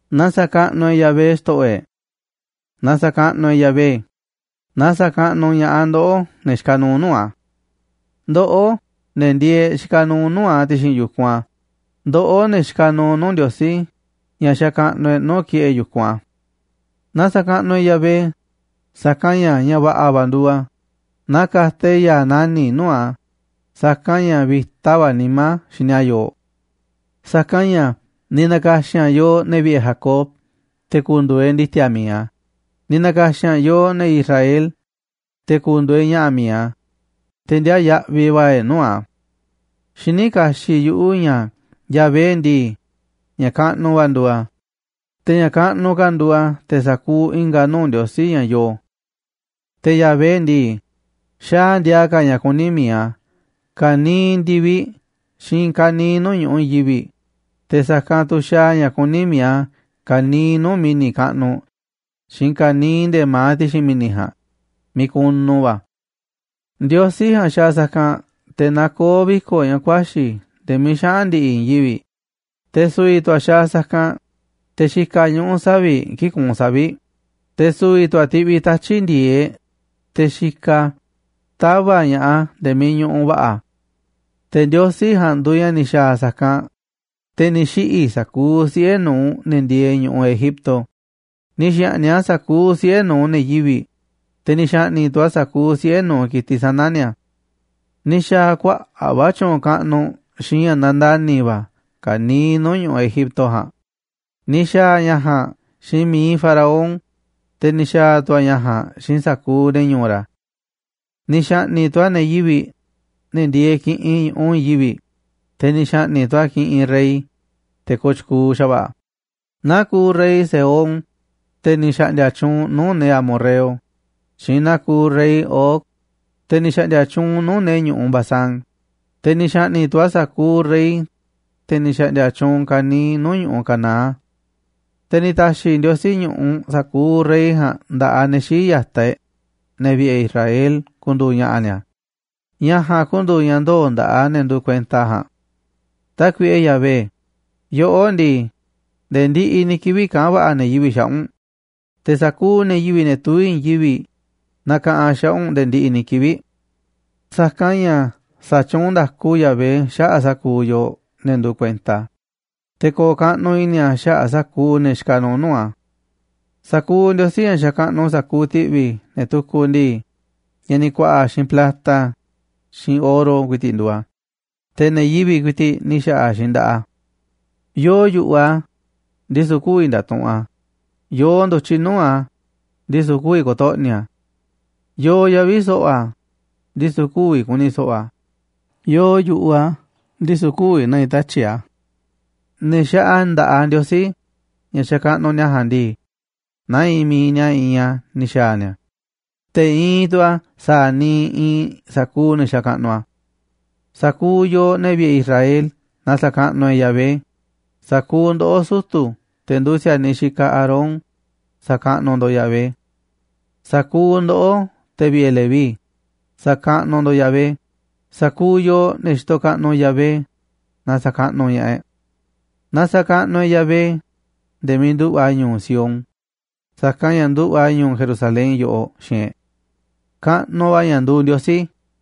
Na sa̱kaꞌnuꞌ e̱ꞌ Yahvé, xto̱ꞌo̱ e̱ꞌ. Na sa̱kaꞌnuꞌ e̱ꞌ Yahvé, na sa̱kaꞌnuꞌ ña̱ꞌaꞌ ndoꞌó, ne̱ xikaꞌ nuuꞌ nuu̱ꞌ a̱. Ndoꞌó, ne̱ ndieeꞌ xikaꞌ nuuꞌ nuu̱ꞌ a̱ ti̱xi̱n yu̱kunꞌ a̱, ndoꞌó, ne̱ xikaꞌ nuuꞌ nuu̱ꞌ Ndiosí ña̱ xakaꞌnuꞌ e̱ꞌ nuu̱ꞌ ki̱ꞌe̱ yu̱kunꞌ a̱. Na sa̱kaꞌnuꞌ e̱ꞌ Yahvé, sa̱kanꞌ ña̱ va̱ꞌa̱ va̱ nduuꞌ a̱, na ka̱ta̱ e̱ꞌ ya̱a̱ nani̱ꞌ nuu̱ꞌ a̱, sa̱kanꞌ ña̱ vi̱ta va̱ nimá a̱ xini a̱ yooꞌ. Sa̱kanꞌ ña̱ ni̱ na̱ka̱xi̱n a̱ yooꞌ, ne̱ vi̱ꞌe̱ Jacob, te̱ ku̱ndu̱u̱ e̱ꞌ ndi̱ti̱a̱ mi̱iꞌ a̱, ni̱ na̱ka̱xi̱n a̱ yooꞌ, ne̱ Israel, te̱ ku̱ndu̱u̱ e̱ꞌ ña̱ꞌa̱ mi̱iꞌ a̱, te̱ ndiaa yaꞌviꞌ va̱ e̱ꞌ nuu̱ꞌ a̱. Xiní kaxiꞌ yuꞌu̱ ña̱ Yahvé ndii, ña̱ kaꞌnuꞌ va̱ nduuꞌ a̱, te̱ ña̱ kaꞌnuꞌ ka̱ nduuꞌ a̱ te̱ sa̱kuuꞌ i̱nga̱ nuu̱ꞌ ndiosí ña̱ yoo. Te̱ Yahvé ndii, xaaꞌ a̱ ndiaa ka̱ ña̱ kuní mi̱iꞌ a̱ ka̱niiꞌ ndi̱viꞌ xiinꞌ i̱i̱n ka̱niiꞌ nuu̱ꞌ ñu̱ꞌuꞌ i̱i̱n yivi̱, te̱ sa̱kanꞌ tu̱ xaaꞌ a̱ ña̱ kuní mi̱iꞌ a̱ ka̱niiꞌ nuu̱ꞌ mi̱ni̱ kaꞌnuꞌ xiinꞌ ka̱niiꞌ nde̱ma̱aꞌ ti̱xi̱n mi̱ni̱ ja̱a̱nꞌ miiꞌ kunu va̱ a̱. Ndiosí ja̱a̱nꞌ xaaꞌ sa̱kanꞌ te̱ nakoó viko̱ꞌ ña̱ ku̱a̱xi̱ nde̱e̱ miiꞌ xaꞌa̱n ndi̱ꞌi̱ i̱i̱n yivi̱ꞌ, te̱ su̱vi̱ tu̱ a̱ xaaꞌ sa̱kanꞌ te̱ xikaꞌ ñuꞌu̱ savi̱ꞌ kii̱ꞌ kuunꞌ savi̱ꞌ, te̱ su̱vi̱ tu̱ a̱ tiꞌviꞌ tatyi̱ꞌ ndi̱e̱eꞌ te̱ xikaꞌ a̱ tava̱ꞌ ña̱ꞌaꞌ a̱ nde̱e̱ miiꞌ ñuꞌuꞌ va̱ꞌa̱ a̱. Te̱ Ndiosí ja̱a̱nꞌ tu̱ nduuꞌ ña̱ ni̱ xa̱a̱ sa̱kanꞌ, te̱ ni̱ xiꞌi̱ sa̱kuuꞌ siꞌe̱ nu̱uꞌ ne̱ ndieeꞌ ñu̱ꞌuꞌ Egipto, ni̱ xa̱ꞌni̱ꞌ a̱ sa̱kuuꞌ siꞌe̱ nu̱uꞌ ne̱ yivi̱ꞌ, te̱ ni̱ xa̱ꞌni̱ꞌ tu̱ a̱ sa̱kuuꞌ siꞌe̱ nu̱uꞌ ki̱tiꞌ sana̱ ni̱a̱. Ni̱ xa̱a̱ a̱ kuaꞌa̱ꞌ va̱ tyu̱u̱n kaꞌnuꞌ xiinꞌ ña̱ nandani̱ va̱ ka̱niiꞌ nuu̱ꞌ ñu̱ꞌuꞌ Egipto ja̱a̱nꞌ, ni̱ xa̱a̱ a̱ ña̱ ja̱a̱nꞌ xiinꞌ mi̱iꞌ Faraón, te̱ ni̱ xa̱a̱ tu̱ a̱ ña̱ ja̱a̱nꞌ xiinꞌ sa̱kuuꞌ ne̱ ñu̱u̱ ra̱. Ni̱ xa̱ꞌni̱ꞌ tu̱ a̱ ne̱ yivi̱ꞌ, ne̱ ndieeꞌ kiꞌinꞌ ñu̱ꞌuꞌ i̱i̱n yivi̱ꞌ, te̱ ni̱ xa̱ꞌni̱ꞌ tu̱ a̱ kiꞌinꞌ rey, te̱ kooꞌ tyukuuꞌ xa̱va̱ꞌa̱, naa kuuꞌ rey Sehón, te̱ ni̱ xa̱ꞌndi̱a̱ tyuunꞌ nuu̱ꞌ ne̱ amorreo, xiinꞌ naa kuuꞌ rey Og, te̱ ni̱ xa̱ꞌndi̱a̱ tyuunꞌ nuu̱ꞌ ne̱ ñu̱ꞌuꞌ Basán, te̱ ni̱ xa̱ꞌni̱ꞌ tu̱ a̱ sa̱kuuꞌ rey, te̱ ni̱ xa̱ꞌndi̱a̱ tyuunꞌ ka̱niiꞌ nuu̱ꞌ ñu̱ꞌuꞌ Canaán. Te̱ ni̱ ta̱xi̱ Ndiosí ñu̱ꞌuꞌ sa̱kuuꞌ rey ja̱a̱nꞌ nda̱ꞌaꞌ ne̱ xii̱ꞌ ya̱taꞌ e̱ꞌ, ne̱ vi̱ꞌe̱ Israel, ku̱ndu̱u̱ ña̱ꞌa̱ ni̱a̱, ña̱ ja̱a̱nꞌ ku̱ndu̱u̱ ña̱ ndoo̱ nda̱ꞌaꞌ ne̱ nduuꞌ kuenta a̱ ja̱a̱nꞌ. Tákuiꞌe Yahvé, yoꞌó ndii, nde̱e̱ ndiꞌiꞌ ni̱ kivi̱ꞌ kaꞌa̱n va̱ꞌa̱ ne̱ yivi̱ꞌ xaꞌa̱ꞌ u̱nꞌ, te̱ sa̱kuuꞌ ne̱ yivi̱ꞌ, ne̱ tuví i̱i̱n yivi̱ꞌ, nakaꞌanꞌ xaꞌa̱ꞌ u̱nꞌ nde̱e̱ ndiꞌiꞌ ni̱ kivi̱ꞌ. Sa̱kanꞌ ña̱ sa̱tyuunꞌ nda̱ku Yahvé xaꞌa̱ꞌ sa̱kuuꞌ yooꞌ, ne̱ nduuꞌ kuenta a̱, te̱ ko̱o̱ kaꞌnuꞌ i̱ni̱ a̱ xaꞌa̱ꞌ sa̱kuuꞌ ne̱ xikaꞌ nuuꞌ nuu̱ꞌ a̱. Sa̱kuuꞌ ndiosí ña̱ xakaꞌnuꞌ sa̱kuuꞌ ti̱ꞌvi̱ ne̱ tukuꞌ ndii, ña̱ ni̱ ku̱a̱ꞌa̱ xiinꞌ plata xiinꞌ oro ku̱i̱ti̱ꞌ nduuꞌ a̱, te̱ ne̱ yivi̱ꞌ ku̱i̱ti̱ꞌ ni̱ xa̱ꞌa̱ xiinꞌ nda̱ꞌaꞌ a̱. Yoo yu̱ꞌuꞌ a̱, ndisu̱ kü̱vi̱ nda̱tuꞌunꞌ a̱, yoo ndu̱tyiꞌ nuu̱ꞌ a̱, ndisu̱ kü̱vi̱ ko̱to̱ꞌni̱ a̱. Yoo yavi̱ so̱ꞌo̱ a̱, ndisu̱ kü̱vi̱ ku̱ni̱ so̱ꞌo̱ a̱, yoo yu̱ꞌuꞌ a̱, ndisu̱ kü̱vi̱ na̱ꞌi̱ tatyi̱ꞌ a̱. Ne̱ xaꞌa nda̱ꞌaꞌ ndiosí ña̱ xakaꞌnuꞌ ni̱a̱ ja̱a̱nꞌ ndii, naa iinꞌ mi̱iꞌ ni̱a̱ iinꞌ a̱ ni̱ xa̱a̱ ni̱a̱, te̱ iinꞌ tu̱ a̱ sa̱a̱ niiꞌ iinꞌ sa̱kuuꞌ ne̱ xakaꞌnuꞌ a̱. Sa̱kuuꞌ yooꞌ, ne̱ vi̱ꞌe̱ Israel, na sa̱kaꞌnuꞌ e̱ꞌ Yahvé, sa̱kuuꞌ ndoꞌó, sutu̱, te̱ nduuꞌ si̱a̱niꞌ xikaꞌ Aarón, sa̱kaꞌnuꞌ ndo̱ꞌ Yahvé. Sa̱kuuꞌ ndoꞌó, te̱ vi̱ꞌe̱ Leví, sa̱kaꞌnuꞌ ndo̱ꞌ Yahvé, sa̱kuuꞌ yooꞌ, ne̱ xitoꞌ kaꞌnuꞌ Yahvé, na sa̱kaꞌnuꞌ ña̱ꞌaꞌ e̱ꞌ. Na sa̱kaꞌnuꞌ e̱ꞌ Yahvé nde̱e̱ miiꞌ nduꞌu̱ꞌ a̱ ñu̱u̱ Sión, sa̱kanꞌ ña̱ nduꞌu̱ꞌ a̱ ñu̱u̱ Jerusalén yoꞌoꞌ xiinꞌ e̱ꞌ. Kaꞌnuꞌ va̱ ña̱ nduuꞌ Ndiosí.